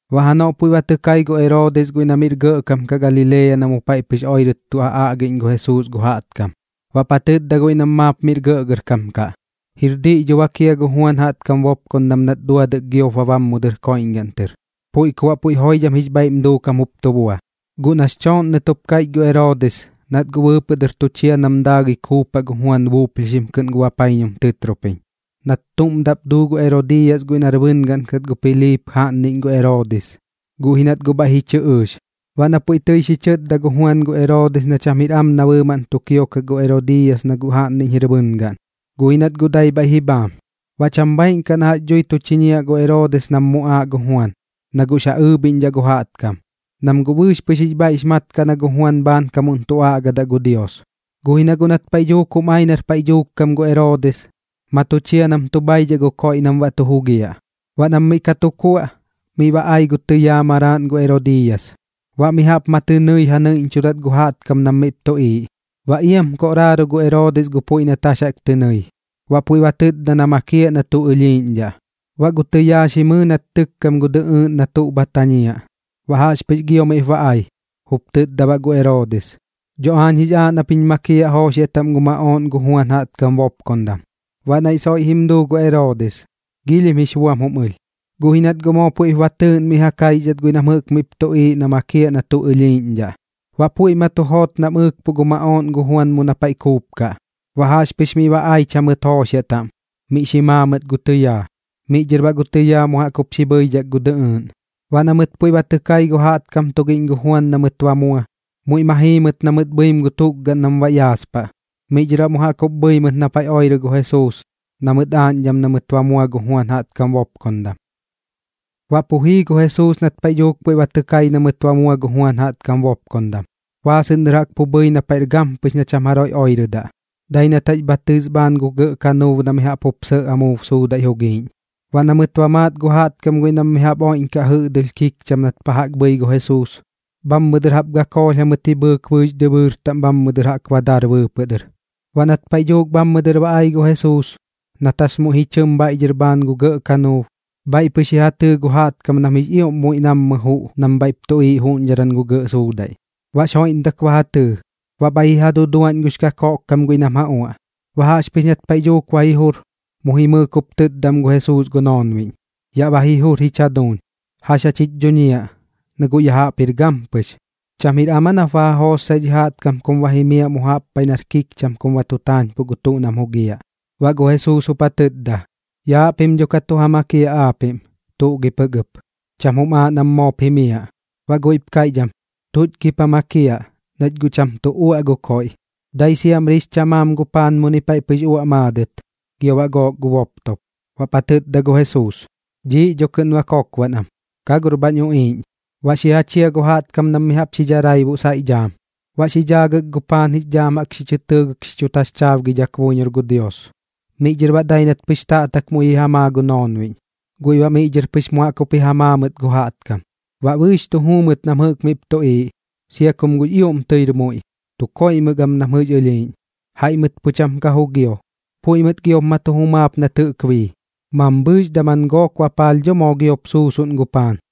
Baꞌ janoꞌ puiꞌ ba tɨ kai gu Eroodis guiꞌ na miꞌr gɇꞌkam kaꞌ Galilea na mu paiꞌ pɨx oirɨt tu ja aꞌgiꞌñ gu Jesuus gu jaꞌtkam. Baꞌp ja tɨtda guiꞌ nam maap miꞌr gɇꞌgɇrkam kaꞌ: ―¿Jir diꞌ dho bak jia gu Juan jaꞌtkam bopkondam nat duadɨk giop ba bam mu dɨr koiꞌñgaꞌn tɨr? Puiꞌ ku baꞌ puiꞌ joidham jix bhaiꞌm duukam jup tu bua. Guꞌ nax chooꞌnnɨt jup kaiꞌch gu Eroodis, nat guꞌ bɨɨpɨꞌ dɨr tu chia nam daagɨi kuupaꞌ gu Juan buuplhixim kɨꞌn gu bapaiñum tɨtropiñ, nat tuꞌm daꞌp duu gu Erodiiyas guiꞌ nar bɨngaꞌn kat gu Piliip jaꞌnniꞌñ gu Eroodis, guꞌ ji nat guꞌ bhaiꞌ ji chɨ ɨɨx. Baꞌ na puiꞌ tɨi xi chɨtdadaꞌ gu Juan gu Eroodis na cham jir am na bɨɨmaꞌn tu kiokaꞌ gu Erodiiyas na guꞌ jaꞌnniꞌñ jir bɨngaꞌn, guꞌ ji nat guꞌ dai bhaiꞌ ji bhaam. Baꞌ cham bhaaiꞌn kaꞌ na jax dhui tu chiñiaꞌ gu Eroodis nam muꞌaaꞌ gu Juan na guꞌx ja ɨɨbhiꞌñdhaꞌ gu jaꞌtkam, nam guꞌ bɨɨx pɨx jix bhaiꞌx mat kaꞌ na gu Juan bhaankamuꞌn tu aꞌgadaꞌ gu Dios. Guꞌ ji na guꞌ nat paiꞌ dhuuk jum ai nar paiꞌ dhuuk kam gu Eroodis, ma tu chia nam tu bhaidhaꞌ gu koiꞌ nam baꞌ tu jugiaꞌ. Baꞌ nam miꞌ ka tu kuaꞌ, miꞌ ba ai gu tɨyaa maraaꞌn gu Erodiiyas, baꞌ mi jaꞌp ma tɨ nɨi ja nɨiꞌñchudat gu jaꞌtkam nam miꞌp tuꞌiiꞌ. Baꞌ iam koꞌraaro gu Eroodis gu puiꞌ nat jax jaꞌk tɨ nɨi, baꞌ puiꞌ ba tɨtda na makiaꞌ na tuꞌ ɨlhiiꞌñdhaꞌ. Baꞌ gu tɨyaa xi mɨɨ nat tɨkkam gu dɨꞌɨɨꞌn na tuꞌ bha tañiaꞌ, baꞌ jaꞌxpɨx gio miꞌp ba ai, jup tɨtda baꞌ gu Eroodis: ―Dho aañ jix aaꞌ nap jiñ makiaꞌ jooxiaꞌ taꞌm gu maꞌooꞌn gu Juan jaꞌtkam bopkondam. Baꞌ naiꞌ soiꞌ jim duu gu Eroodis, giilhim jix buam jum ɨlh. Guꞌ ji nat guꞌ moo puiꞌp ba tɨɨꞌn miꞌ ja kaixdhat guiꞌ nam jɨꞌk miꞌp tuꞌiiꞌ na makiaꞌ na tuꞌ ɨlhiiꞌñdhaꞌ, baꞌ puiꞌ ma tu joot nam ɨɨkpuꞌ gu maꞌooꞌn gu Juan mu na paiꞌ kuupkaꞌ. Baꞌ jaꞌxpɨx miꞌ ba aich jamɨt jooxiaꞌ taꞌm, miꞌ xi maa mɨt gu tɨyaa. Miꞌ dhɨr baꞌ gu tɨyaa mu jaꞌk jup xi bhɨidhak gu dɨꞌɨɨꞌn. Baꞌ na mɨt puiꞌ ba tɨ kai gu jaꞌtkam tugiꞌñ gu Juan na mɨt ba mua, muiꞌ ma jii mɨt na mɨt bhɨim gu tukgaꞌn nam baꞌ yaaspaꞌ. Miꞌ dhɨr baꞌ mu jaꞌk jup bhɨi mɨt na paiꞌ oirɨ gu Jesuus na mɨt aaꞌñdham na mɨt ba mua gu Juan jaꞌtkam bopkondam. Baꞌ pu jii gu Jesuus nat paiꞌ dhuuk puiꞌ ba tɨ kai na mɨt ba mua gu Juan jaꞌtkam bopkondam, baasɨꞌn dɨr jaꞌk pu bhɨi na paiꞌr gampɨx kaꞌ na cham jaroiꞌ oirɨdaꞌ, dai nat jax bha tɨs bhaan gu gɇꞌ kanuub na mi jaꞌp jup sɇꞌ amuub suudaiꞌ jugiiꞌñ. Baꞌ na mɨt ba maat gu jaꞌtkam guiꞌ nam mi jaꞌp oiꞌñkaꞌ jɨꞌdɨlh kikcham nat pa jaꞌk bhɨi gu Jesuus, bhammɨ dɨr jaꞌp gakoolh jamɨt ji bhɨɨk bɨɨx dɨbɨɨr taꞌm bhammɨ dɨr ba dar bɨɨpɨꞌ dɨr. Baꞌ nat paiꞌ dhuuk bhammɨ dɨr ba ai gu Jesuus, nat jax muiꞌ ji chɨm bhaiꞌ dhɨr bhaan gu gɇꞌ kanuub, bhaiꞌ pɨx ji ja tɨɨ gu jaꞌtkam nam jix ioꞌm muiꞌ nammɨ juꞌ nam bhaiꞌp tuꞌiiꞌ juꞌñdharan gu gɇꞌ suudaiꞌ. Baꞌx joiꞌmdak ba ja tɨɨ, baꞌ bhaiꞌ ji ja duduaꞌñ gux kakoꞌkkam guiꞌ nam ja uaꞌ. Baꞌ jaꞌxpɨx nat paiꞌ dhuuk ba ji jur, mu jimɨɨk jup tɨtda am gu Jesuus gu noonbiꞌñ: ―Yaꞌ ba ji jur jich jaduuñ. ¿Jax jach jich dhuñiaꞌ, na guꞌ ya jaꞌp jir gampɨx? ¿Cham jir am aa nap ba ja jootsaꞌ dhi jaꞌtkam kum ba jimiaꞌ mu jaꞌp paiꞌ nar kikcham kum ba tu taañpuꞌ gu tuꞌ nam jugiaꞌ? Baꞌ gu Jesuus jup ja tɨtda: ―Yaaꞌ pim dho ka tu ja makiaꞌ aapiꞌm, ¿tuꞌ gi pɨk ɨp? Cham jum aaꞌ nam moop jimiaꞌ. Baꞌ guiꞌp kaiꞌch am: ―¿Tuꞌch gip ja makiaꞌ, nach guꞌ cham tuꞌ uaꞌ gu tuꞌ koiꞌ? Dai siamri jɨꞌk jix chamaam gu paan muni paiꞌ pɨx uaꞌ maadɨt, gio baꞌ gook gu boptop. Baꞌp ja tɨtda gu Jesuus: ―Dhiiꞌ dho kɨꞌn ba kokbaꞌn am. ¡Ka gor bhañ uꞌiiꞌñ! Baꞌ xi ja chia gu jaꞌtkam nam mi jaꞌp xi dharaibuꞌ saiꞌ dhaam, baꞌ xi dhaagɨk gu paan jix dhaam jaꞌk xi chɨ tɨɨgɨk xi chu taxchaabgi buiñor gu Dios. Miꞌ dhɨr baꞌ dai nat pɨx taꞌtak muiꞌ ji ja maa gu noonbiꞌñ, guiꞌ baꞌ miꞌ dhɨr pɨx mu jaꞌk jup ji ja maa mɨt gu jaꞌtkam. Baꞌ bɨɨx tu juu mɨt nam jɨꞌk miꞌp tuꞌiiꞌ, sia kum guꞌx ioꞌm tɨir muiꞌ, tu koiꞌmɨk am nam jɨꞌx ɨlhiiꞌñ. Jaiꞌ mɨt pu cham ka jugio. Puiꞌ mɨt giop ma tu jumaap nat jɨꞌk bii, mambhɨɨx daman gook bapaalh dho moo giop suusuꞌn gu paan.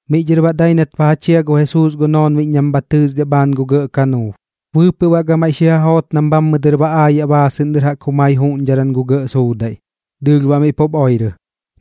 Miꞌ dhɨr baꞌ dai nat ba ja chia gu Jesuus gu noonbiꞌñ nam bha tɨɨsdiaꞌ bhaan gu gɇꞌ kanuub, bɨɨpɨꞌ baꞌ gamaiꞌ xi ja joot nam bhammɨ dɨr ba aayaꞌ baasɨꞌn dɨr jaꞌk jumai juꞌñdharan gu gɇꞌ suudaiꞌ. Dɨɨlh baꞌ miꞌ pup oirɨ,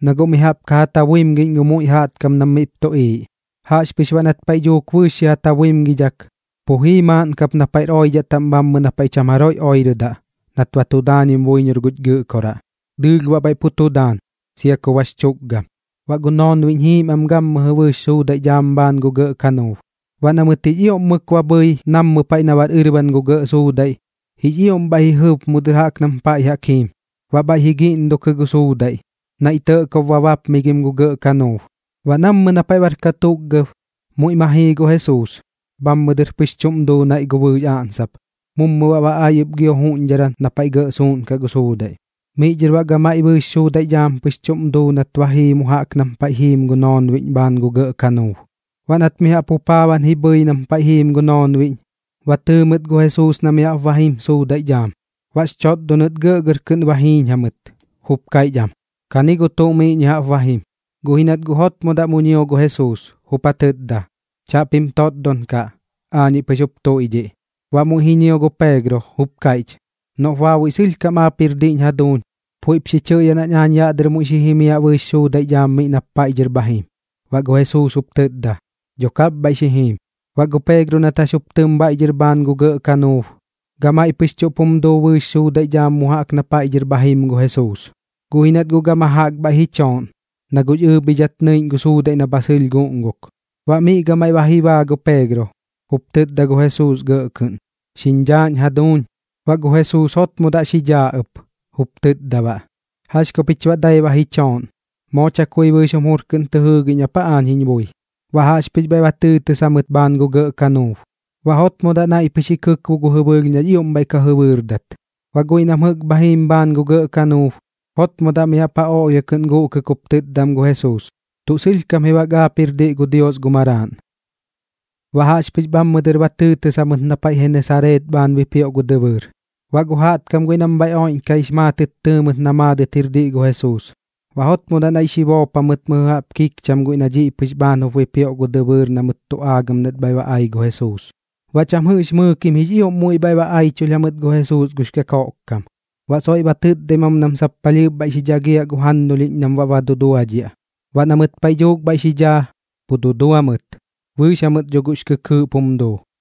na guꞌ mi jaꞌp ka tabuimgiꞌñ gu muiꞌ jaꞌtkam nam miꞌp tuꞌiiꞌ. Jaꞌxpɨx baꞌ nat paiꞌ dhuuk bɨɨx xi ja tabuimgidhak, pu jii maaꞌn kap na paiꞌr oidhaꞌ taꞌm bhammɨ na paiꞌ cham jaroiꞌ oirɨdaꞌ nat ba tu daañim buiñor guch Gɨꞌkoraꞌ. Dɨɨlh baꞌ bhaiꞌ pu tu daan, sia ku bax chukgam. Baꞌ gu noonbiꞌñ jiim am gammɨjɨ bɨɨx suudaiꞌ dhaam bhaan gu gɇꞌ kanuub. Baꞌ na mɨt jix ioꞌm mɨk ba bhɨi nammɨ paiꞌ na bar ɨrban gu gɇꞌ suudaiꞌ, jix ioꞌm bhaiꞌ ji jɨb mu dɨr jaꞌk nam paiꞌ jaꞌk jiim, baꞌ bhaiꞌ ji giꞌndukɨ gu suudaiꞌ, naiꞌ tɇꞌkob ba baapmigim gu gɇꞌ kanuub. Baꞌ nammɨ na paiꞌ bar katukgab, muiꞌ ma jii gu Jesuus, bhammɨ dɨr pɨx chuꞌm duu naiꞌ gu bɨɨx aꞌnsap, mummɨ baꞌ ba ai ɨp gio juꞌñdharan na paiꞌ gɇꞌ suuꞌnkaꞌ gu suudaiꞌ. Miꞌ dhɨr baꞌ gamaiꞌ bɨɨx suudaiꞌ dhaam pɨx chuꞌm duu nat ba jii mu jaꞌk nam paiꞌ jiim gu noonbiꞌñ bhaan gu gɇꞌ kanuub. Baꞌ nat mi jaꞌp jupaaban ji bhɨi nam paiꞌ jiim gu noonbiꞌñ, ba tɨɨ mɨt gu Jesuus na mi jaꞌp ba jim suudaiꞌ dhaam. Baꞌx chotdonɨt gɇꞌgɇr kɨꞌn ba jiiñ jamɨt, jup kaiꞌch am: ―¡Kani gu tuꞌ mi jaꞌp ba jim! Guꞌ ji nat guꞌ jotmodaꞌ mu ñio gu Jesuus, jup ja tɨtda: ―Chaꞌpim totdon kaꞌ. Aañiꞌ pɨx jup tuiꞌdhiꞌ. Baꞌ muiꞌ ji ñio gu Peegro, jup kaiꞌch: ―Noꞌp baabuiꞌ sɨlhkam aap jir diꞌñ jaduuñ, puiꞌp xi chɨꞌyaꞌ nañ aañ yaꞌ dɨr muiꞌ xi jimiaꞌ bɨɨx suudaiꞌ dhaam miꞌ nap paiꞌ dhɨr bha jim. Baꞌ gu Jesuus jup tɨtda: ―Dho kap bhaiꞌ xi jim. Baꞌ gu Peegro nat jax jup tɨm bhaiꞌ dhɨr bhaan gu gɇꞌ kanuub, gamaiꞌ pɨx chuꞌp jum duu bɨɨx suudaiꞌ dhaam mu jaꞌk na paiꞌ dhɨr bha jim gu Jesuus. Guꞌ ji nat guꞌ gama jaꞌk bhaiꞌ ji chooꞌn, na guꞌx ɨɨbhidhat nɨiꞌñ gu suudaiꞌ na bha sɨlh guꞌnguk. Baꞌ miꞌ gamaiꞌ ba ji baa gu Peegro, jup tɨtda gu Jesuus gɇꞌ kɨꞌn: ―¡Xiñ dhaaꞌñ jaduuñ! Baꞌ gu Jesuus jotmodaꞌ xi dhaa ɨp, jup tɨtda baꞌ: ―¿Jax ku pich baꞌ dai ba ji chooꞌn? ¿Moo chakui bɨɨx jum jur kɨꞌn tɨ jɨɨgiꞌñ ap aa aañ jiñ bui? Baꞌ jaꞌxpɨx bhaiꞌ ba tɨɨtɨs jamɨt bhaan gu gɇꞌ kanuub, baꞌ jotmodaꞌ naiꞌ pɨx ji kɨkbo gu jɨbɨɨlh na jix ioꞌm bhaiꞌ ka jɨbɨɨrdat. Baꞌ guiꞌ nam jɨꞌk bha jiim bhaan gu gɇꞌ kanuub, jotmodaꞌ mi jaꞌp ja oꞌlhia kɨꞌn guꞌkɨk jup tɨtda am gu Jesuus: ―Tuꞌ sɨlhkam ji bak aap jir diꞌ gu Dios gu Maraaꞌn. Baꞌ jaꞌxpɨx bhammɨ dɨr ba tɨɨtɨs jamɨt na paiꞌ Genesareet bhaan bipioꞌ gu dɨbɨɨr. Baꞌ gu jaꞌtkam guiꞌ nam bhaiꞌ oiꞌñkaꞌ jix maatɨt tɨɨ mɨt na maadɨt jir diꞌ gu Jesuus, baꞌ jotmodaꞌ naiꞌ xi boop jamɨt mɨjɨ jaꞌp kikcham guiꞌ na dhiꞌ pɨx bhaan jup bipioꞌ gu dɨbɨɨr na mɨt tu aagam nat bhaiꞌ ba ai gu Jesuus. Baꞌ cham jɨꞌx mɨɨkim jix ioꞌm muiꞌ bhaiꞌ ba aichulh jamɨt gu Jesuus gux kakoꞌk kam, baꞌ soiꞌ ba tɨtdaim am nam sap palhɨɨp bhaiꞌ xi dhagiaꞌ gu jannulhiꞌñ nam baꞌ ba duduadhiaꞌ. Baꞌ na mɨt paiꞌ dhuuk bhaiꞌ xi dhaa, pu dudua mɨt, bɨɨx jamɨt dho guꞌx kɨkɨɨꞌp jum duu.